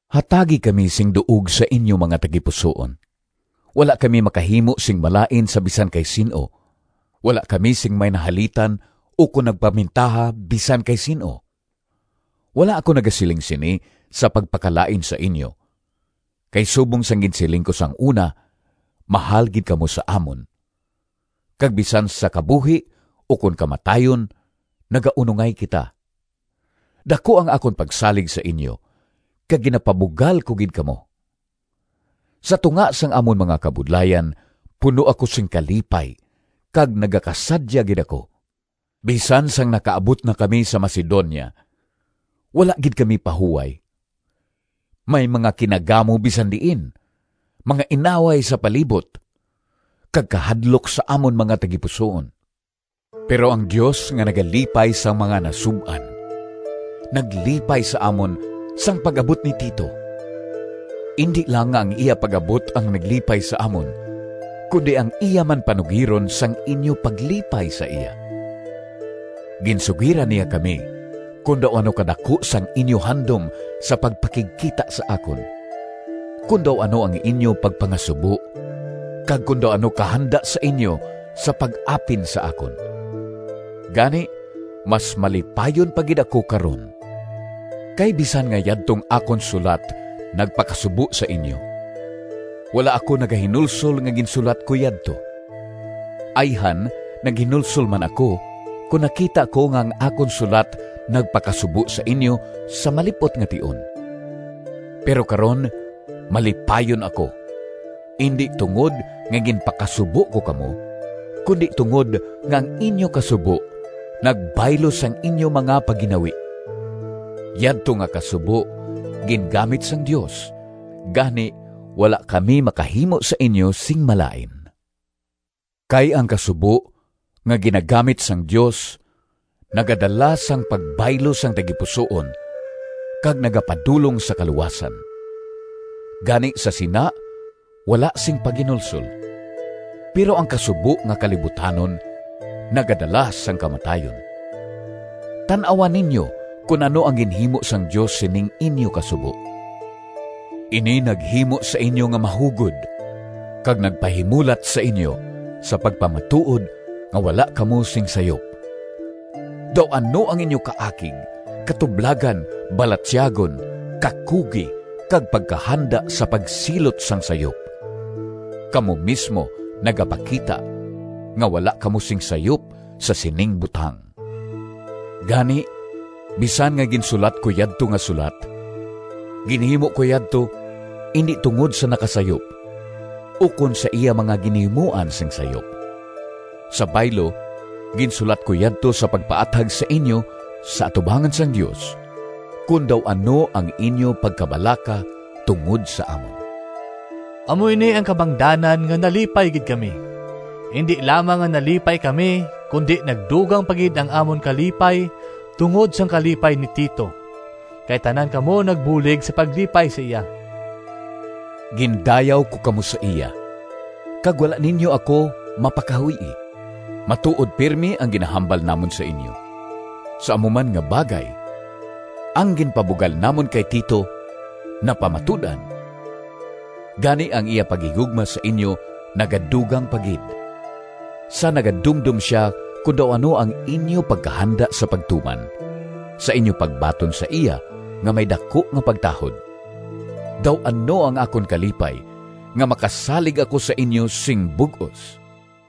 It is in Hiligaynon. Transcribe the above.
Hatagi kami sing duog sa inyo mga tagipusoon. Wala kami makahimo sing malain sa bisan kay sin-o, wala kami sing may nahalitan ukon nagpamintaha bisan kay sin-o. Wala ako nagasiling sini sa pagpakalain sa inyo, kay subong sang ginsiling ko sang una, mahal gid kamo sa amon, kag bisan sa kabuhi ukon kamatayon nagaunongay kita. Daku ang akon pagsalig sa inyo, kag ginapabugal ko gid kamo! Sa tunga sang amon mga kabudlayan, puno ako sing kalipay kag nagakasadya gid ako. Bisan sang nakaabot na kami sa Macedonia, wala gid kami pahuway. May mga kinagamo bisan diin, mga inaway sa palibot, kag kahadlok sa amon mga tagipusoon. Pero ang Dios nga nagalipay sang mga nasub-an, naglipay sa amon sang pag-abot ni Tito. Indi lang nga ang iya pag-abot ang naglipay sa amon, kundi ang iya man panugiron sang inyo paglipay sa iya. Ginsugiran niya kami kon daw ano kadaku sang inyo handom sa pagpakigkita sa akon, kon daw ano ang inyo pagpangasubo, kag kon daw ano kahanda sa inyo sa pag-apin sa akon. Gani, mas malipayon pa gid ako karon. Kay bisan nga yadtong akon sulat nagpakasubo sa inyo, wala ako nagahinulsol nga ginsulat ko yadto. Ayhan naghinulsol man ako kon nakita ko nga ang akon sulat nagpakasubo sa inyo sa malip-ot nga tion. Pero karon malipayon ako, indi tungod nga ginpakasubo ko kamo, kundi tungod nga ang inyo kasubo nagbaylo sang inyo mga pagginawi. Yadto nga kasubo gingamit sang Dios, gani wala kami makahimo sa inyo sing malain. Kay ang kasubo nga ginagamit sang Dios nagadala sang pagbaylo sang tagipusoon kag nagapadulong sa kaluwasan, gani sa sina wala sing paghinulsol. Pero ang kasubo nga kalibutanon nagadala sang kamatayon. Tan-awa ninyo kon ano ang ginhimo sang Dios sining inyo kasubo: ini naghimo sa inyo nga mahugod kag nagpahimulat sa inyo sa pagpamatuod nga wala kamo sing sayop! Daw ano ang inyo kaakig, katublagan, balatyagon, kakugi, kag pagkahanda sa pagsilot sang sayop! Kamo mismo nagapakita nga wala kamo sing sayop sa sining butang. Gani, bisan nga ginsulat ko yadto nga sulat, ginhimo ko yadto, indi tungod sa nakasayop, ukon sa iya nga ginhimuan sing sayop. Sa baylo, ginsulat ko yadto sa pagpaathag sa inyo sa atubangan sang Dios, kon daw ano ang inyo pagkabalaka tungod sa amon. Amo ini ang kabangdanan nga nalipay gid kami. Indi lamang nga nalipay kami, kundi nagdugang pa gid ang amon kalipay tungod sang kalipay ni Tito, kay tanan kamo nagbulig sa paglipay sa iya. Gindayaw ko kamo sa iya, kag wala ninyo ako mapakahuy-i. Matuod pirme ang ginahambal namon sa inyo. Sa amo man nga bagay, ang ginpabugal namon kay Tito napamatud-an. Gani ang iya paghigugma sa inyo nagadugang pa gid, sa nagadumdom sia kon daw ano ang inyo pagkahanda sa pagtuman, sa inyo pagbaton sa iya nga may daku nga pagtahod. Daw ano ang akon kalipay nga makasalig ako sa inyo sing bug-os!